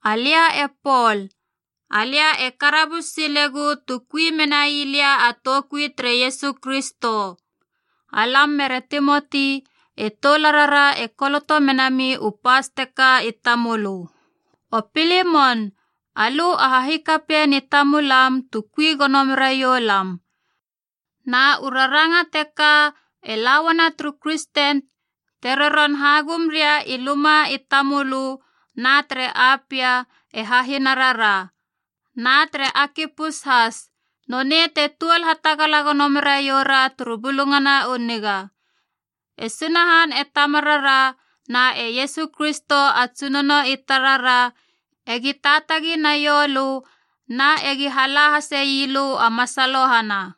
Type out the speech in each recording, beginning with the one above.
Alia e Pol, alia e karabus silegu tu kui menai lia a toukui tere Iesu Kristo. Alam mere Timoti, e toularara e koloto menami u pas teka i tamölö. O Pilimon, alö a hahikapien i tamulam tu kui gono meraioulam. Na u raranga teka e la uana turu kristen te roron hagum ria i luma i tamölö na tere Apia, e hahinarara, na tere Akipus has, nonei te tuol hatagala gono meraiou ra turu Bulungana u Niga. E Sunahan e Tamarara na e Iesu Kristo a Tsunono i tarara egi taatagi naioulö na egi hala hase ii lö a masalohana.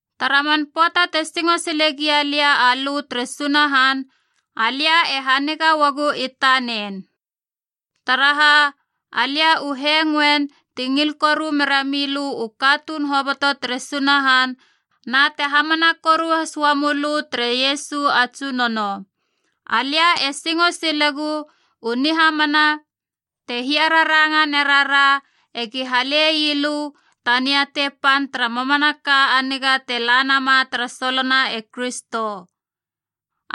Tara man pöata te singo sile gia lia alö tere Sunahan, alia e haniga uagu i tanen. Taraha, alia u hengoen te ngil koru mera mi lö u katuun hoboto tere Sunahan na te hamana koru has ua mölö tere Iesu a Tsunono. Alia e singo silegu u nihamana te hiararanga nerara ega hale ii lö ta niatei pan tara mamanaka a niga te la nama tara solona e Kristo.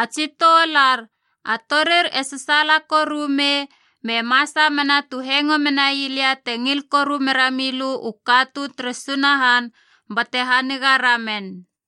A tsi toular, a torir e sasaala koru me masa mena tu hengo menai lia te ngil koru merami lö u katuun tere Sunahan bate haniga ramen.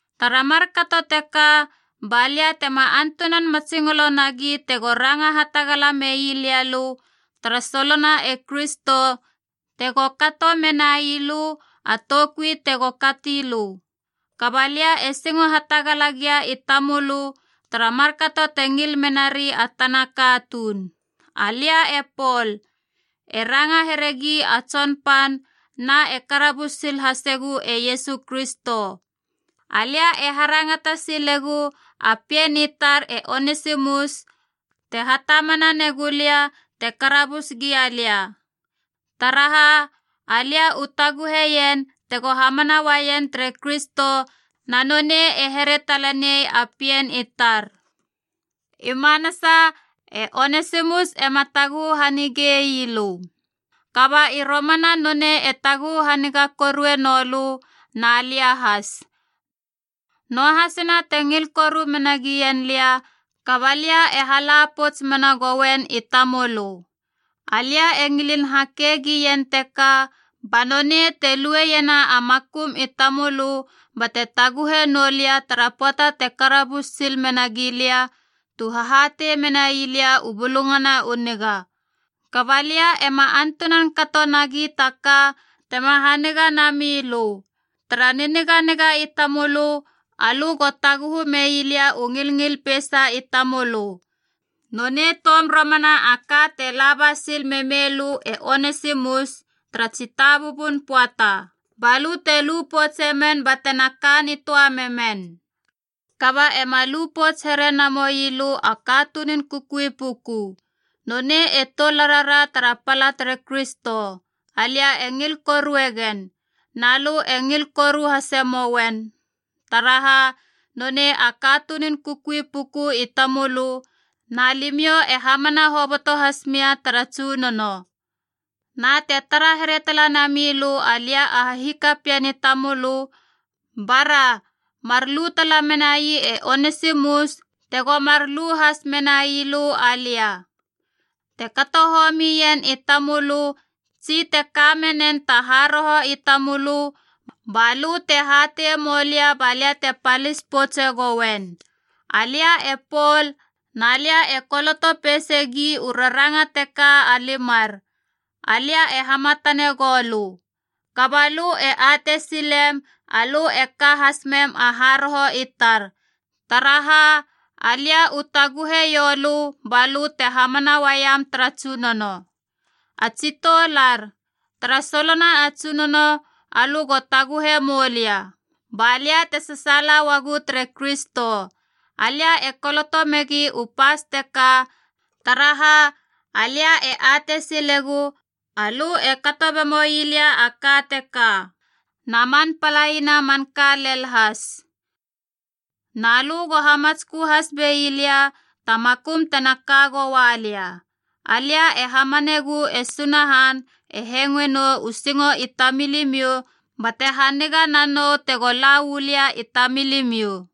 Tara markato teka, ba lia tema antunan matsingolo nagi tego ranga hatagala meilia lö tara solona e Kristo tego kato menai lö a toukui tego kati lö. Kaba lia e singo hatagala gia i tamölö tara markato te ngil menari a tana katuun. Alia e Pol, e ranga heregi a tsonpan na e karabus sil hasegu e Iesu Kristo. Alia e harangata silegu a pien i tar e Onesimus te hatamana negulia te karabus gia lia, taraha alia u taguheien tego hamana uaien tere Kristo na nonei e here talenei a pien i tar. I manasa e Onesimus ema taguhu hanigei lö. Kaba i romana nonei e taguhu haniga korue noulö na lia has. Noahasina te ngil koru menagien lia, kaba lia e hala pouts mena goien i tamölö. Alia e ngilin hake gien teka ba nonei te lueiena a makum i tamölö bate taguhe noua lia tara pöata te karabus sil menagi lia tu hahatei menai lia u Bulungana u Niga. Kaba alia ema antunan kato nagi ta ka tema haniga nami lö. Tara niniganiga i tamölö, alö go taguhu mei lia u ngilngil peisa i tamölö. Nonei toum romana a ka te laba sil memei lö e Onesimus tara tsitabubun pöata, balö te lupoutse men batena kanitöa memen. Kaba ema lupouts here namoi lö a katunun kukui puku. Nonei e toularara tara pala tere Kristo. Alia e ngil korue gen. Na lö e ngil koru hase moen, taraha nonei a katunun kukui puku i tamölö na limiou e hamana hoboto has mia tara Tsunono. Na te tara here tala namilö alia a hahikapien i tamölö, bara, mar lu tala menai e Onesimus tego mar lu has menailö alia. Te kato homien i tamölö, tsi te ka menen ta haroho i tamölö, ba lö te hateie moulia balia te palis poutse gouen. Alia e Pol na lia e koloto peisegi u raranga teka a limar, alia e hamatane gou lö. Kaba lö e atei silem alö e ka has mem a haroho i tar, taraha alia u taguhe ioulö balö te hamana uaiem tara Tsunono. A tsi toular, tara solona a Tsunono alö go taguhe moulia, ba lia te sasaala uagu tere Kristo. Alia e koloto megi u pas teka taraha, alia e atei silegu alö e kato bemoi lia a ka teka, na man palaina a manka lel has. Na lö go hamatskö has bei lia ta makum tena ka goua lia. Alia e hamanegu e Sunahan e hengoe nou u singo i tamilimiou bate haniga nanou tego la uu lia i tamilimiou.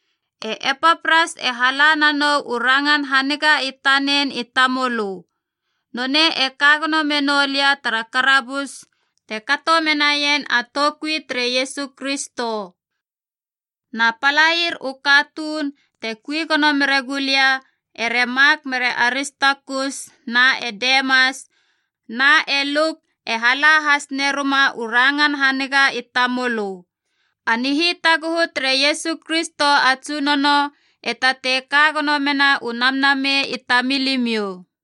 E Epapras e hala nanou u rangan haniga i tanen i tamölö. Nonei e ka gono menou lia tara karabus te kato menaien a toukui tere Iesu Kristo. Na palair u katuuna te kui gono mere gulia ere Mak mere Aristakus na e Demas na e Luk e hala has neruma u rangan haniga i tamölö. A nihitaguhu tere Iesu Kristo a Tsunono e tatei ka gono mena u namnamei i tamilimiou.